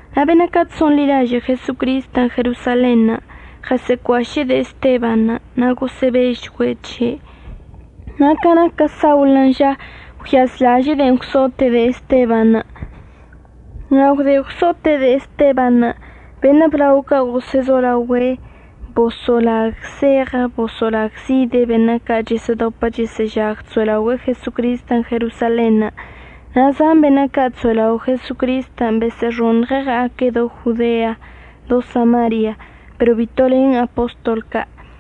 Na' beṉə' ca' chso'onḻilažə' Jesocristən' Jerosalenṉə' ɉəsə'əcuaše'e de'e Esteban', na' gosə'əbežchgüe' c̱he'. Na' ca naquə Saulən' ža, gwyazlaže'e de'en gwso'ote' de'e Estebanṉə'. Na' gwde gwso'ote' de'e Estebanṉə' beṉə' blao ca' gosə'əzolaogüe' boso'olagzeɉə boso'olagzide' beṉə' ca' chəsə'ədopə chəsə'əžag chso'elaogüe'e Jesocristən' Jerosalenṉə', na' zan beṉə' ca' chso'elao' Jesocristən' besə'əxoṉɉe' ɉa'aque' do Jodean', do Samarian', pero bito len apostol ca'.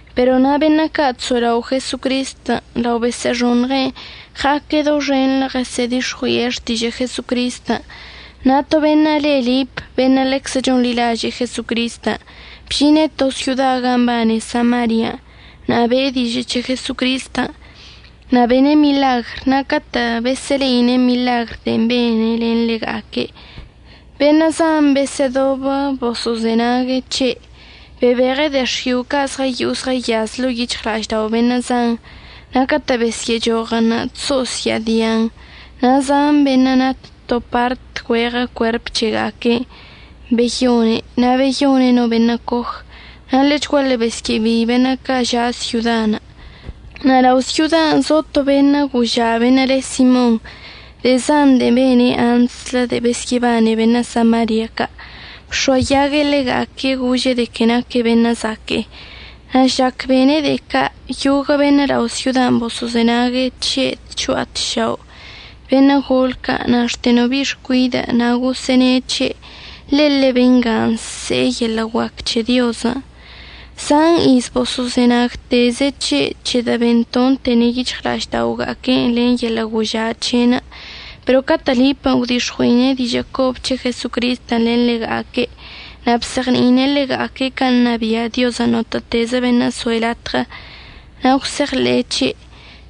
Pero na' beṉə' ca' chso'elao' Jesocristən' lao besə'əxoṉɉe' ɉa'aque' doxenḻə ɉəsə'ədix̱ɉui'e xtižə' Jesocristən'. Na' to beṉə' le Lip beṉə' ḻeczə chonḻilažə' Jesocristən' bžine' to syoda ga mbane Samarian' na' be'e dižə' c̱he Jesocristən'. Na' bene' miḻagr na' catə' besə'əle'ine' miḻagrən' de'en bene' len ḻega'aque' beṉə' zan besə'ədobə boso'ozenague' c̱he'. Bebeɉe' de'e x̱io' ca' zɉəyo'o zɉəyaz ḻo'o yic̱hɉla'aždao' beṉə' zan, na' catə' besyə'əchoɉən' chso'osya'adi'an. Na' zan beṉə' nat to part güeɉə cuerp c̱hega'aque'enə' beyone' na' beyone' no beṉə' coj. Na' ḻechguaḻe besyə'əbei beṉə' ca' ža' syodan'. Na' lao' syodan' zo to beṉə' goža' beṉə' le Simon. De'e zan de'e bene' antslə de'e besyə'əbane beṉə' Samaria ca', bx̱oayague' ḻega'aque' gože' de que naque' beṉə' zaque'e. Na' žlac bene' de'e ca' yoguə' beṉə' lao' syodan' boso'ozenague' c̱he' tcho'a tšao', beṉə' gol ca' na' xte no bi'i xcuidə' na' gosə'əne' c̱he': ―Ḻele bengan' nse'e yeḻə' guac c̱he Diozən'. Zan iz boso'ozenagteze' c̱he' c̱hedə' bentontene' yic̱hɉla'ažda'oga'aque'enə' len yeḻə' goža' c̱he'enə'. Pero catə' Lipən' gwdix̱ɉui'e dižə' cobə c̱he Jesocristən' len ḻega'aque' na' bzeɉni'ine' ḻega'aque' can' ṉabia' Diozən' notə'ətezə beṉə' soe' latɉə, na' gwse'eɉḻe'e c̱he',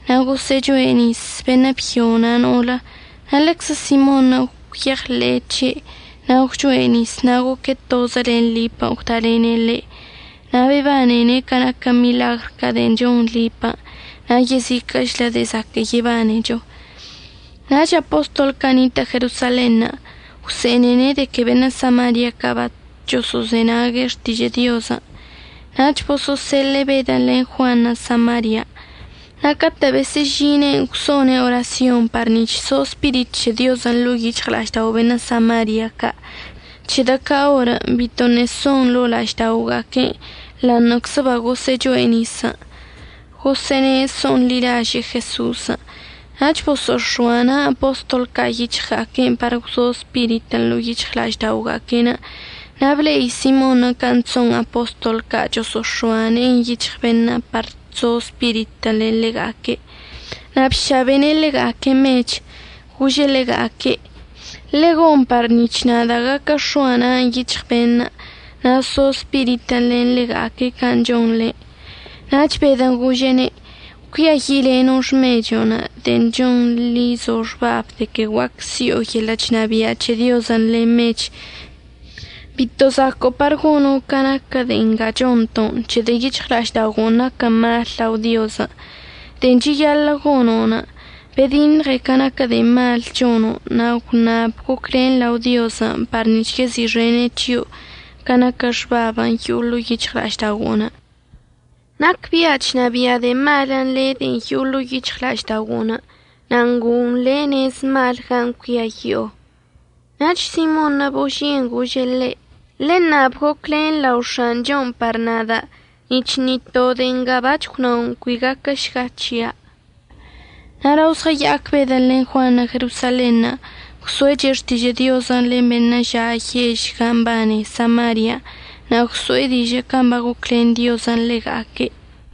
na' gosə'əchoe' nis, beṉə' byo na' no'olə. Na' lenczə Simonṉə' gwyeɉḻe'e c̱he', na' gwchoe' nis na' goque' tozə len Lipən' gwdalene' ḻe', na' bebanene' ca naquə miḻagr ca' de'en chon Lipən' na' yeziquə'əchlə de'e zaquə' yebanczecho. Nach apostol ca' nitə' Jerosalenṉə' gwse'enene' de que beṉə' Samaria ca' bachoso'ozenague' xtižə' Diozən', nach boso'oseḻe'e Bedən' len Juanṉə' Samarian'. Na' catə' besə'əžine'enə' gwso'one' orasyonṉə' par nic̱h so Spirit c̱he Diozən' ḻo'o yic̱hɉla'aždao' beṉə' Samaria ca', c̱hedə' ca orən' bitoṉə' son ḻo'o la'ažda'oga'aque'enə' ḻa'aṉə'əczə bagosə'əcho'e nisən' gosə'əne' so'onḻilaže'e Jeso'osən'. Nach boso'ox̱oa na' apostol ca' yic̱hɉga'aque'enə' par gwzo Spiritən' ḻo'o yic̱hɉla'ažda'oga'aque'enə'. Na' ble'i Simonṉə' can' chso'on apostol ca' choso'ox̱oa ne'en yic̱hɉ beṉə' par chzo Spiritən' len ḻega'aque', na' bšabene' ḻega'aque' mech. Gože' ḻega'aque': ―Ḻegon par nic̱h nada' gaquə x̱oa na'anə' yic̱hɉ beṉə' na' so Spiritən' len ḻega'aque' can' chonḻe. Nach Bedən' gože'ene': ―Cuiayi'ileno' xmecho'onə' de'en chonḻizo' xbabən' de que guac si'o yeḻə' chnabia' c̱he Diozən' len mech. Bito zaco'o par gono' ca naquə de'e nga chonto' c̱hedə' yic̱hɉla'ažda'ogo'onə' naquən mal lao Diozən'. De'en cheyaḻə' gono', bediṉɉe ca naquə de'e malən' chono' na' gwnab goclen lao Diozən' par nic̱h yezi'ixene' c̱hio' ca naquə xbabən' yo'o ḻo'o yic̱hɉla'ažda'ogo'onə'. Nacbia' chnabia' de'e malən' le' de'en yo'o ḻo'o yic̱hɉla'ažda'ogo'onə' na' ngo'on le' nez malən' gan' cuiayi'o. Nach Simonṉə' boži'en gože' ḻe': ―Ḻeṉab goclen lao X̱anchon' par nada' nic̱h ni to de'e nga bac̱h gwnao' cui gaquəšga c̱hia'. Na' lao zɉəya'ac Bedən' len Juanṉə' Jerosalenṉə' gwso'eche' xtižə' Diozən' len beṉə' ža' yež zan gan' mbane Samarian' na' gwso'e dižə' can' bagoclen Diozən' ḻega'aque'.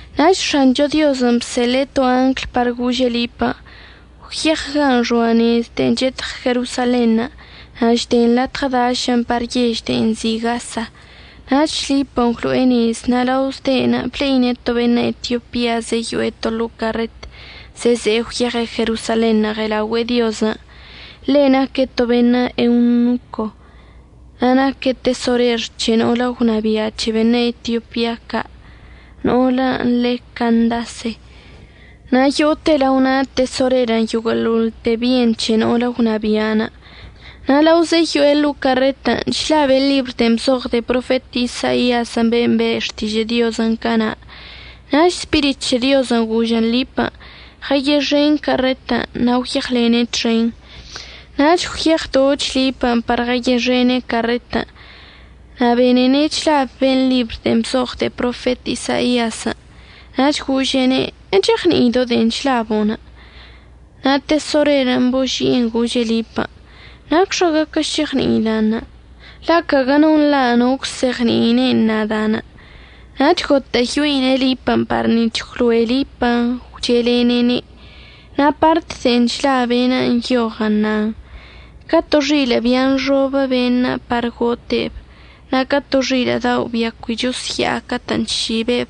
Nach X̱ancho Diozən' bseḻe'e to angl par gože' Lipən': ―Gwyeɉ gan' xoa nez de'en chetɉ Jerosalenṉə' na' chden latɉə dašən' par yež de'en nzi' Gasa. Nach Lipən' gwlo'e nezən' na' lao zde'enə' ble'ine' to beṉə' Etiopia zeyo'e to ḻo'o carret zeze'e gwyeɉe' Jerosalenṉə' ɉe'elaogüe'e Diozən'. Ḻe' naque' to beṉə' eunoco na' naque' tesorer c̱he no'olə gwnabia' c̱he beṉə' Etiopia ca' no'olən' le' Candase, na' yo'ote lao na' tesorerən' yoguə'əḻoḻte byen c̱he no'olə gwnabia'anə'. Na' lao zeyo'e ḻo'o carretən' chlabe' ḻibr de'en bzoɉ de'e profet Isaiazən' ben' be' xtižə' Diozən' cana'. Nach Spirit c̱he Diozən' gožən Lipən': ―Ɉəyexen carretən' na' gwyeɉlene' txen. Nach gwyeɉdoch Lipən' par ɉəyexene' carretən' na' benene' chlab ben' ḻibr de'en bzoɉ de'e profet Isaiazən'. Nach gože'ene': ―¿Echeɉni'ido' de'en chlabo'onə'? Na' tesorerən' boži'en gože' Lipən': ―¿Nacxa gaquə šeɉni'ida'anə'? la' caguə no nḻa' no əgwzeɉni'ine'en nada'anə'. Nach gotə'əyoine' Lipən' par nic̱h gwloe Lipən' gwche'elene'ene'. Na' part de'en chlabe'enə' nyoɉən' nan: Ca to xilə' bia nxobə beṉə' par gote'eb, na' ca to xilə' dao' bia cui chosya'a catə' chšibe'eb,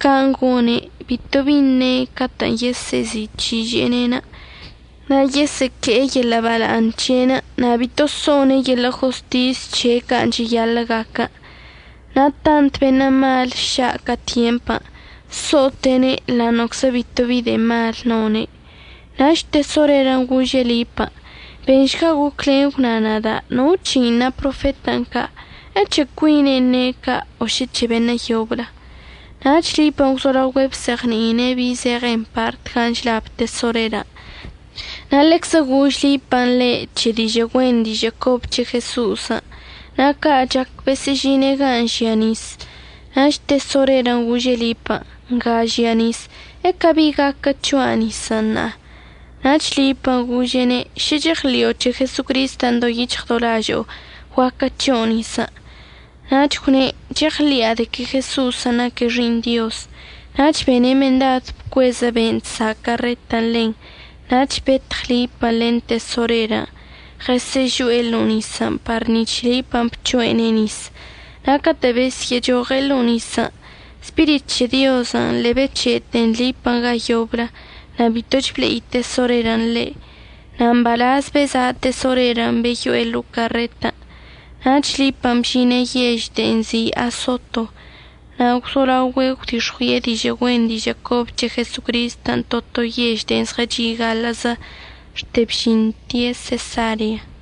can' gone', bito bi əṉe' catə'ən yesə'əzi'ic̱hiže'ene'. Na' yesə'əque'e yeḻə' bala'aṉ c̱he'enə'. Na' bito so'one' yeḻə' jostis c̱he' can' cheyaḻə' gaquən. Na' tant beṉə' mal ša' ca tyempən', so'ote'ene' ḻa'aṉə'əczə bito bi de'e mal none'. Nach tesorerən' gože' Lipən': ―Benšga goclen gwna nada' no c̱hein' na profetən' ca', ¿əc̱he cuine'en ne' ca' o šə c̱he beṉə' yoblə? Nach Lipən' gwzolaogüe' bzeɉni'ine' bi zeɉen part gan' chlab tesorerən' na' ḻeczə gož Lipən' le' c̱he dižə' güen dižə' cobə c̱he Jeso'osən'. Na' ca' chac besə'əžine' ga žia nis, nach tesorerən' gože' Lipən': ―Nga žia nis. ¿Ecabi gaquə c̱hoa' nisən' ṉa'a? Nach Lipən' gože'ene': ―Šə cheɉḻi'o c̱he Jesocristən' do yic̱hɉ do lažo'o, guaquə c̱ho' nisən'. Nach gwne': ―Cheɉḻi'a de que Jesocristən' naque' Xi'iṉ Diozən'. Nach bene' mendad bcuezə ben' chsa' carretən' ḻen, nach betɉ Lipən' len tesorerən' ɉəsə'əžo'e ḻo'o nisən' par nic̱h Lipən' bc̱ho'ene' nis. Na' catə' besyə'əchoɉe' ḻo'o nisən', Spirit c̱he Diozən' ḻe'e bec̱he'ete Lipən' ga yoblə, na' bitoch ble'i tesorerən' ḻe'. Na' mbalaz beza' tesorerən' beyo'e ḻo'o carretən'. Nach Lipən' bžine' yež de'en nzi' Asoto na' gwzolaogüe' gwdix̱ɉui'e dižə' güen dižə' cobə c̱he Jesocristən' to to yež de'e zɉəchi' gaḻə'əzə xte bžinte' Sesarean'.